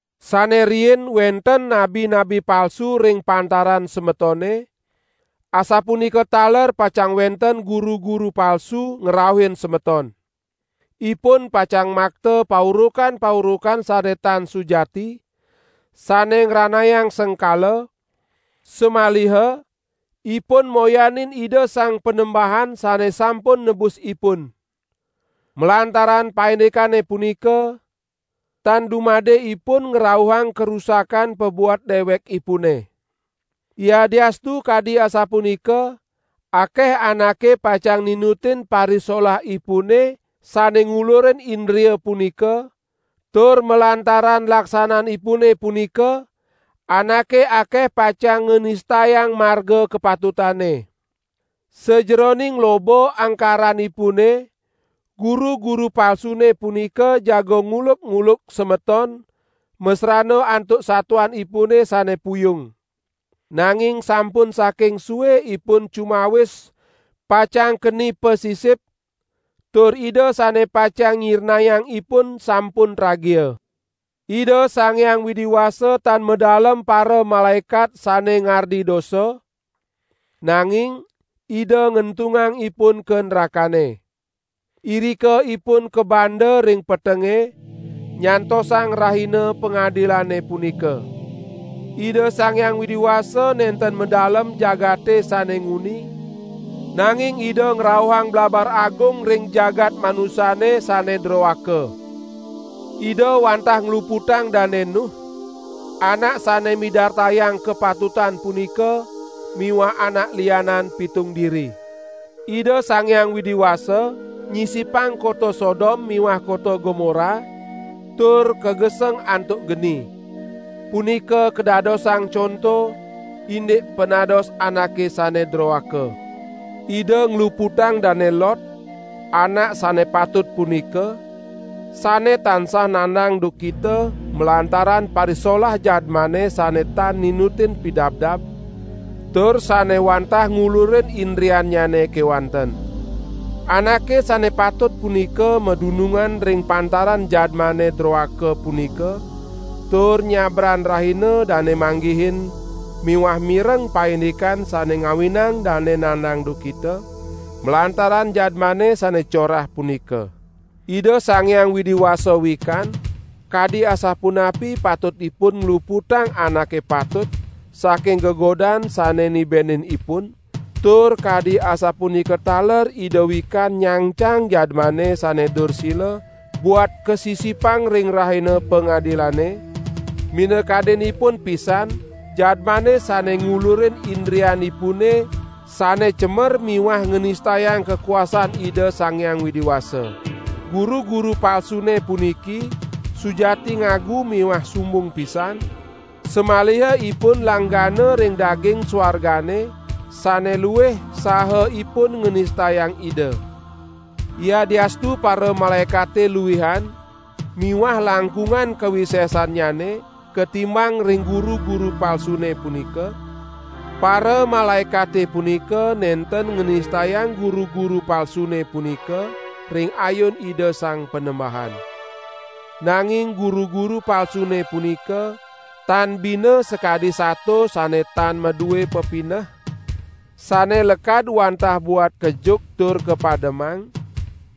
Sane riin wenten nabi-nabi palsu ring pantaran semetone, asapunika taler pacang wenten guru-guru palsu ngrauhin semeton. Ipun pacang makta paurukan-paurukan sane tan sujati, sane ngranayang sengkala, samaliha ipun moyanin Ida Sang Panembahan sane sampun nebus ipun. Malantaran paindikane punika, tan dumade ipun ngrauhang karusakan pabuat dewekipune. Yadiastu kadi asapunika akeh anake pacang ninutin parisolahipune sane ngulurin indria punika, tur malantaran laksananipune punika anake akeh pacang nganistayang Marga Kapatutane. Sajeroning loba angkaranipune, guru-guru palsune punika jaga nguluk-uluk semeton masrana antuk satuanipune sane puyung. Nanging sampun saking sue ipun cumawis pacang keni pasisip tur Ida sane pacang nyirnayang ipun sampun tragia. Ida Sang Hyang Widi Wasa tan madalem paramalaekat sane ngardi dosa, nanging Ida ngentungang ipun ka nrakane. Irika ipun kabanda ring petenge, nyantosang Rahina Pangadilane punika. Ida Sang Hyang Widi Wasa nenten madalem jagate sane nguni, nanging Ida ngrauhang blabar agung ring jagat manusane sane droaka. Ida wantah ngluputang Dane Nuh, anak sane midartayang kapatutan punika miwah anak lianan pitung diri. Ida Sang Hyang Widi Wasa nyisipang kota Sodom miwah kota Gomora tur kageseng antuk geni. Punika kadadosang conto indik panados anake sane droaka. Ida ngluputang Dane Lot, anak sane patut punika, sane tansah nandang duhkita malantaran parisolah jadmane sane tan ninutin pidabdab, tur sane wantah ngulurin indriannyane kewanten. Anake sane patut punika madunungan ring pantaran jadmane droaka punika tur nyabran rahina dane manggihin miwah mireng paindikan sane ngawinang dane nandang duhkita, malantaran jadmane sane corah punika. Ida Sang Hyang Widi Wasa wikan kadi asapunapi patutipun ngluputang anake patut saking gegodan sane nibenin ipun, tur kadi asapunika taler Ida wikan nyangcang jadmane sane dursila buat kasisipang ring Rahina Pangadilane, minakadinipun pisan jadmane sane ngulurin indrianipune sane cemer miwah nganistayang kakuasan Ida Sang Hyang Widi Wasa. Guru-guru palsune puniki sujati ngagu miwah sumbung pisan, samaliha ipun langgana ring daging suargane sane luih saha ipun nganistayang Ida. Yadiastu paramalaekate luihan miwah langkungan kawisesannyane katimbang ring guru-guru palsune punika, paramalaekate punika nenten nganistayang guru-guru palsune punika ring ayun Ida Sang Panembahan. Nanging guru-guru palsune punika, tan bina sakadi sato sane tan madue pepineh, sane lekad wantah buat kejuk tur kapademang,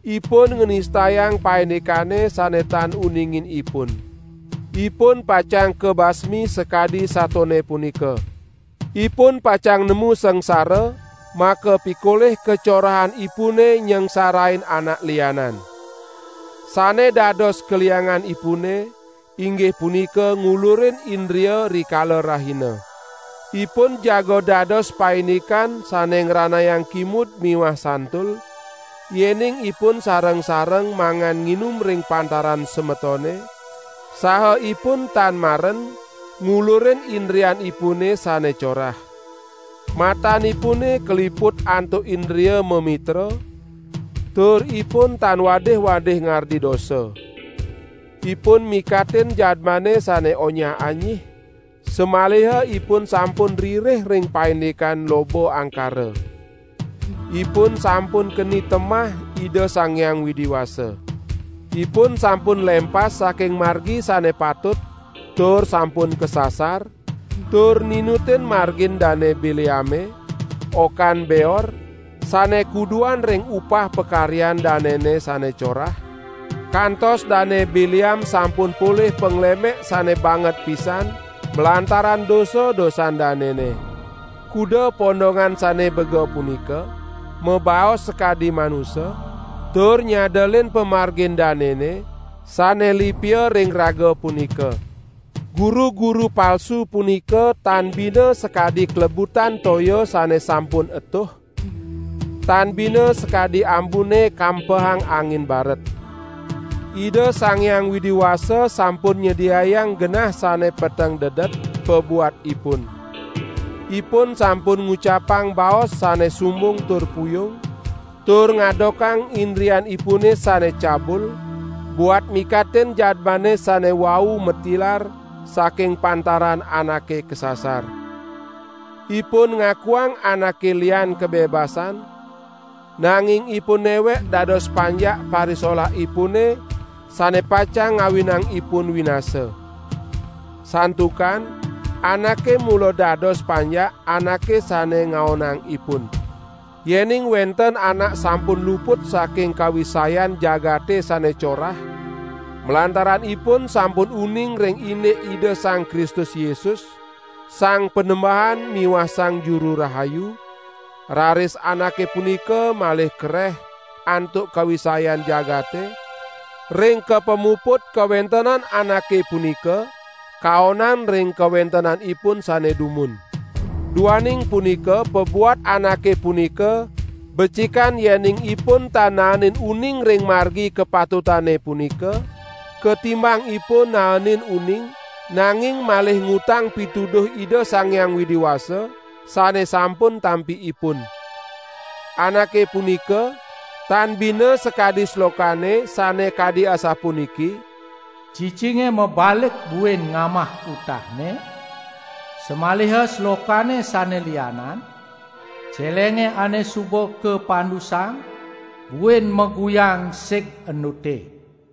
ipun nganistayang paindikane sane tan uningin ipun. Ipun pacang kabasmi sakadi satone punika. Ipun pacang nemu sangsara makapikolih kacorahanipune nyangsarain anak lianan. Sane dados kalianganipune, inggih punika ngulurin indria rikala rahina. Ipun jaga dados paindikan sane ngranayang kimud miwah santul, yening ipun sareng-sareng mangan nginum ring pantaran semetone, saha ipun tan maren ngulurin indrianipune sane corah. Matanipune kaliput antuk indria mamitra, tur ipun tan wadih-wadih ngardi dosa. Ipun mikatin jadmane sane onyah-anyih, samaliha ipun sampun ririh ring paindikan loba angkara. Ipun sampun keni temah Ida Sang Hyang Widi Wasa. Ipun sampun lempas saking margi sane patut tur sampun kasasar, tur ninutin margin Dane Bileame, okan Beor, sane kuduan ring upah pakaryan danene sane corah, kantos Dane Bileam sampun polih panglemek sane banget pisan malantaran dosa-dosan danene. Kuda pondongan sane bega punika, mabaos sakadi manusa, tur nyadelin pamargin danene sane lipia ring raga punika. Guru-guru palsu punika tan bina sakadi klebutan toya sane sampun etuh, tan bina sakadi ambune kampehang angin baret. Ida Sang Hyang Widi Wasa sampun nyediayang genah sane peteng dedet pabuat ipun. Ipun sampun ngucapang baos sane sumbung tur puyung, tur ngadokang indrianipune sane cabul buat mikatin jadmane sane wau matilar saking pantaran anake kasasar. Ipun ngakuang anake lian kabebasan, nanging ipun newek dados panjak parisolahipune sane pacang ngawinang ipun winasa. Santukan anake mula dados panjak anake sane ngaonang ipun. Yening wenten anak sampun luput saking kawisayan jagate sane corah, malantaran ipun sampun uning ring indik Ida Sang Kristus Yesus, Sang Panembahan miwah Sang Juru Rahayu, raris anake punika malih kareh antuk kawisayan jagate, ring ka pamuput kawentenan anake punika kaonan ring kawentenanipun sane dumun. Duaning punika pabuat anake punika becikan yening ipun tan naenin uning ring margi kapatutane punika, katimbang ipun naenin uning, nanging malih ngutang pituduh Ida Sang Hyang Widi Wasa sane sampun tampi ipun. Anake punika tan bina sakadi slokane sane kadi asapuniki: "Cicinge mabalik buin ngamah utahne", samaliha slokane sane lianan: "Celenge ane suba kapandusang, buin maguyang sig endute."